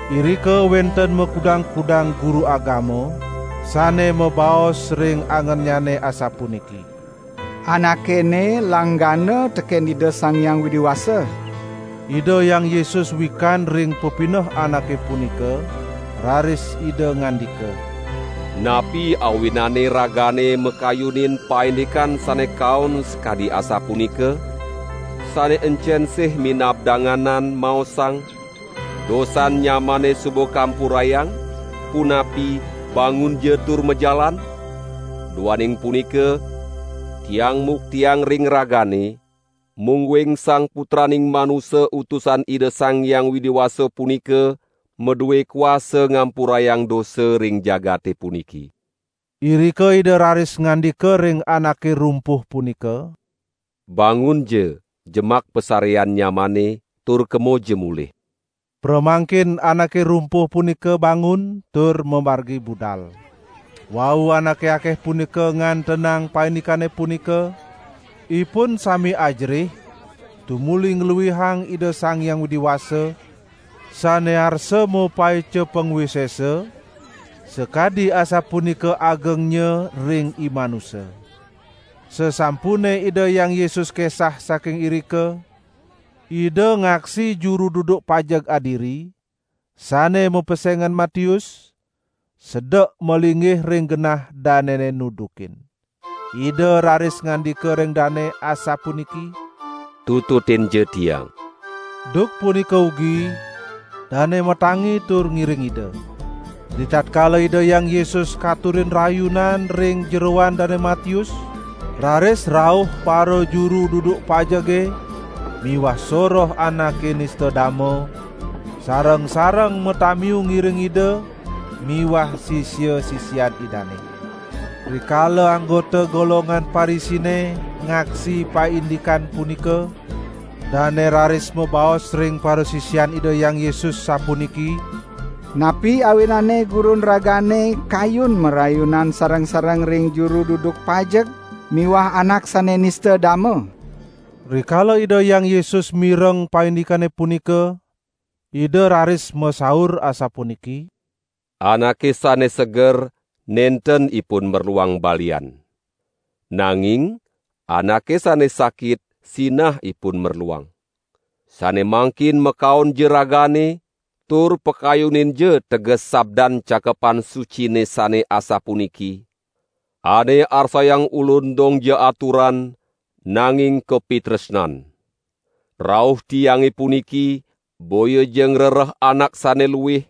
Irika wenten makudang-kudang guru agama sane mabaos ring angennyane asapuniki: "Anake ene langgana teken Ida Sang Hyang Widi Wasa." Ida Hyang Yesus wikan ring pepineh anake punika, raris Ida ngandika: "Napi awinane ragane makayunin paindikan sane kaon sakadi asapunika? Sane encen sih minab danganan, maosang: 'Dosan nyamane suba kampurayang', punapi 'bangunja tur majalan'? Duaning punika, Tiang muktiang ring ragane, mungguing Sang Putraning Manusa utusan Ida Sang Hyang Widi Wasa punika madue kuasa ngampurayang dosa ring jagate puniki." Irika Ida raris ngandika ring anake rumpuh punika: "Bangunja, jemak pasarean nyamane tur kemoja mulih." Pramangkin anake rumpuh punika bangun tur mamargi budal. Wau anake akeh punika ngantenang paindikane punika, ipun sami ajerih tumuli ngluihang Ida Sang Hyang Widi Wasa sane arsa mapaica pangwisesa sakadi asapunika agengnya ring imanusa. Sasampune Ida Hyang Yesus kesah saking irika, Ida ngaksi juru duduk pajeg adiri sane mapesengan Matius, sedek malinggih ring genah danene nudukin. Ida raris ngandika ring dane asapuniki: "Tututinja Tiang." Duk punika ugi dane matangi tur ngiring Ida. Ritatkala Ida Hyang Yesus katurin rayunan ring jeroan Dane Matius, raris rauh parajuru duduk pajege miwah soroh anake nista dama, sareng-sareng matamiu ngiring Ida miwah sisia-sisian Idane. Rikala anggota golongan Parisine ngaksi paindikan punika, dane raris mabaos ring parasisian Ida Hyang Yesus sapuniki: "Napi awinane Gurun ragane kayun marayunan sareng-sareng ring juru duduk pajeg miwah anak sane nista dama?" Rikala Ida Hyang Yesus mireng paindikane punika, Ida raris masaur asapuniki: "Anake sane seger nenten ipun merluang balian. Nanging anake sane sakit sinah ipun merluang. Sane mangkin makaonja ragane tur pakayuninja teges sabdan Cakepan Sucine sane asapuniki: 'Ane arsayang Ulun dongja aturan, nanging kapitresnan.' Rauh tiange puniki boyaja ngrereh anak sane luih,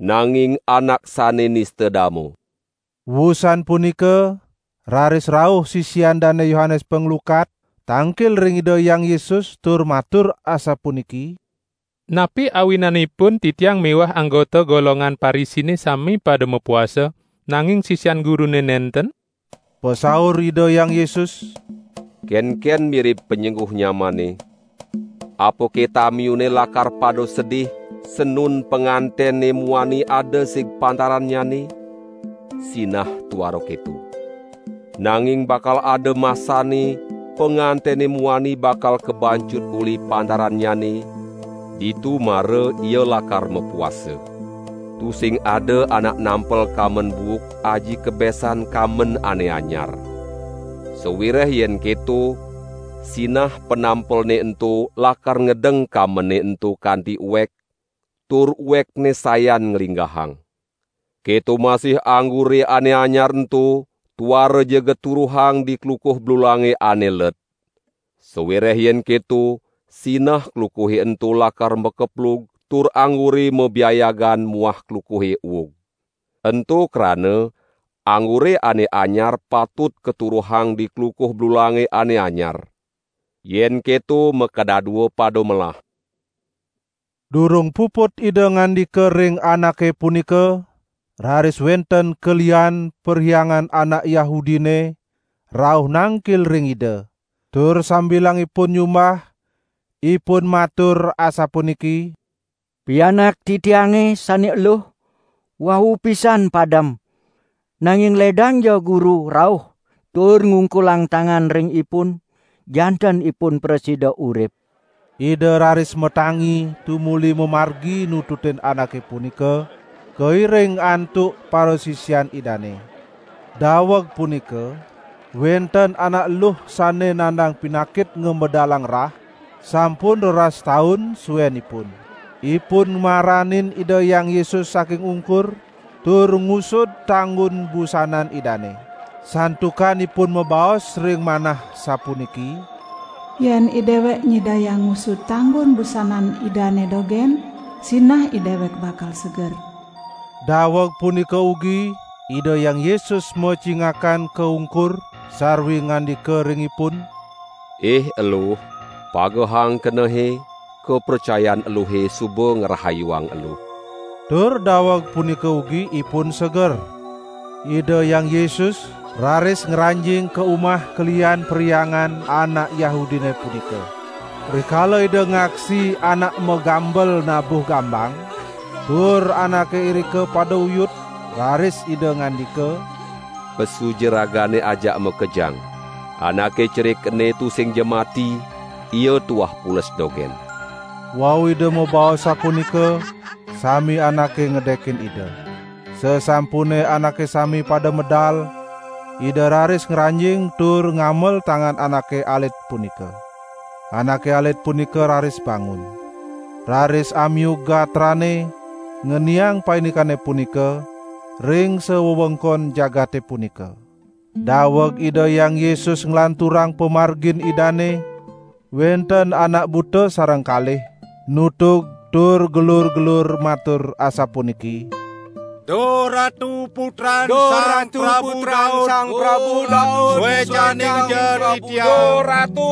nanging anak sane nista dama." Wusan punika, raris rauh sisian Dane Yohanes Panglukat tangkil ring Ida Hyang Yesus tur matur asapuniki: "Napi awinanipun titiang miwah anggota golongan Parisine sami pada mapuasa, nanging sisian Gurune nenten?" Pasaur Ida Hyang Yesus: "Kenken mirib panyengguh nyamane, apake tamiune lakar pada sedih, sanun pangantene muani ada sig pantarannyane? Sinah tuara keto! Nanging bakal ada masanne pangantene muani bakal kabancut uli pantarannyane, ditu mara ia lakar mapuasa. Tusing ada anak nampel kamben buuk aji kebesan kamben ane anyar. Sawireh yen keto, sinah panampelne ento lakar ngedeng kambene ento kanti uek, tur uekne sayan nglinggahang. Keto masih anggure ane anyar ento tuaraja katuruhang di klukuh blulange ane let. Sawireh yen keto sinah klukuhe ento lakar makeplug tur anggure mabiayagan muah klukuhe uug. Ento krana anggure ane anyar patut katuruhang di klukuh blulange ane anyar. Yen keto makadadua pada melah." Durung puput Ida ngandika ring anake punika, raris wenten kelihan perhyangan anak Yahudine rauh nangkil ring Ida, tur sambilangipun nyumbah ipun matur asapuniki: "Pianak titiange sane eluh wau pisan padem, nanging ledangja Guru rauh tur ngungkulang tangan ring ipun, janten ipun prasida urip." Ida raris matangi tumuli mamargi nututin anake punika, kairing antuk parasisian Idane. Daweg punika wenten anak luh sane nandang pinakit ngamedalang rah sampun roras taun suenipun. Ipun maranin Ida Hyang Yesus saking ungkur tur ngusud tanggun busanan Idane. Santukan ipun mabaos ring manah, sapuniki: "Yen idewek nyidayang ngusud tanggun busanan Idane dogen, sinah idewek bakal seger." Daweg punika ugi Ida Hyang Yesus macingakan ka ungkur sarwi ngandika ring ipun: "Ih eluh, pagehang kenehe, kapracayan eluhe suba ngrahayuang eluh." Tur daweg punika ugi ipun seger. Ida Hyang Yesus raris ngranjing ka umah kelihan perhyangan anak Yahudine punika. Rikala Ida ngaksi anak magambel nabuh gambang, tur anake irika pada uyut, raris Ida ngandika: "Pesuja ragane ajak makejang. Anake cerik ene tusingja mati, ia tuah pules dogen." Wau Ida mabaos sapunika, sami anake ngedekin Ida. Sasampune anake sami pada medal, Ida raris ngranjing tur ngamel tangan anake alit punika. Anake alit punika raris bangun. Raris amiug gatrane ngeniang paindikane punika ring sawewengkon jagate punika. Daweg Ida Hyang Yesus nglanturang pamargin Idane, wenten anak buta sareng kalih nutug tur gelur-gelur matur asapuniki: "Duh Ratu Putran Sang Prabu Daud, suecaninja titiang!"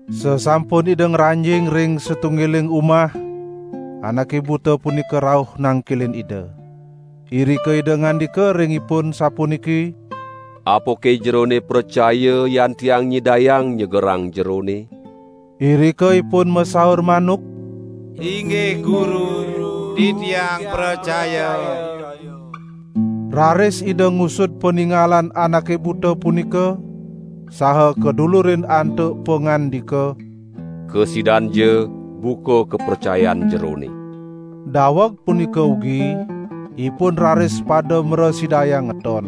Sasampun Ida ngranjing ring satunggiling umah, anake buta punika rauh nangkilin Ida. Irika Ida ngandika ring ipun sapuniki: "Apake jerone pracaya yan Tiang nyidayang nyegerang jerone?" Irika ipun masaur manuk: "Inggih Guru, titiang pracaya!" Raris Ida ngusud paningalan anake buta punika saha kadulurin antuk pangandika: "Kasidanja buka kapracayan jerone!" Daweg punika ugi ipun raris pada mrasidayang ngeton.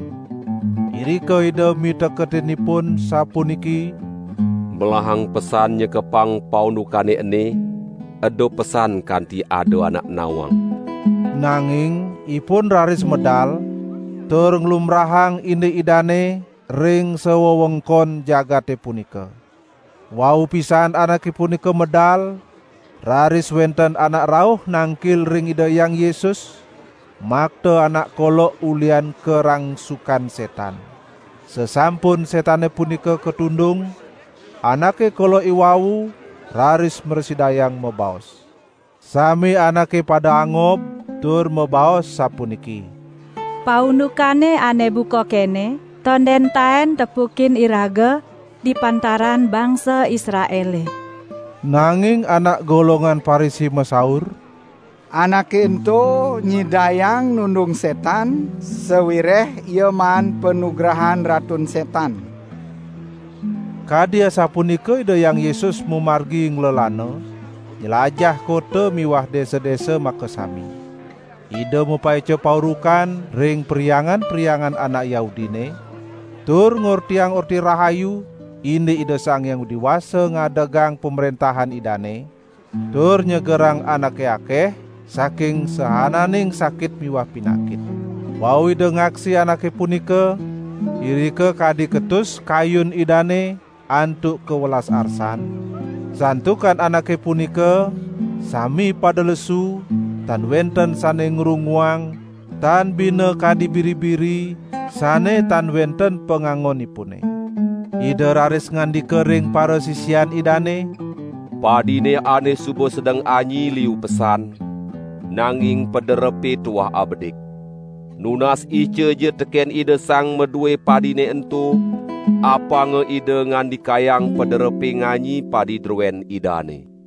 Irika Ida miteketin ipun sapuniki: "Melahang pesan nyekepang paundukane ene, eda pesan kanti ada anak nawang." Nanging ipun raris medal tur nglumbrahang indik Idane ring sawewengkon jagate punika. Wau pisan anake punika medal, raris wenten anak rauh nangkil ring Ida Hyang Yesus makta anak kolok ulihan karangsukan setan. Sasampun setane punika katundung, anake kolok iwau raris mrasidayang mabaos. Sami anake pada angob tur mabaos sapuniki: "Paundukan ane buka kene tonden taen tepukin iraga di pantaran bangsa Israele." Nanging anak golongan Parisi masaur: "Anake ento nyidayang nundung setan, sawireh ia maan panugrahan Ratun Setan." Kadi asapunika Ida Hyang Yesus mamargi nglelana nylajah kota miwah desa-desa makasami. Ida mapaica paurukan ring perhyangan-perhyangan anak Yahudine, tur ngortiang Orti Rahayu indik Ida Sang Hyang Widi Wasa ngadegang Pamrentahan Idane, tur nyegerang anake akeh saking saananing sakit miwah pinakit. Wau Ida ngaksi anake punika, irika kadi ketus kayun Idane antuk kawelas arsan, santukan anake punika sami pada lesu tan wenten sane ngrunguang tan bina kadi biri-biri sane tan wenten pangangonipune. Ida raris ngandika ring parasisian Idane: "Padine ene suba sedeng anyi liu pesan, nanging paderepe tuah abedik. Nunas icaja teken Ida Sang madue padine ento, apanga Ida ngandikayang paderepe nganyi padi druen Idane."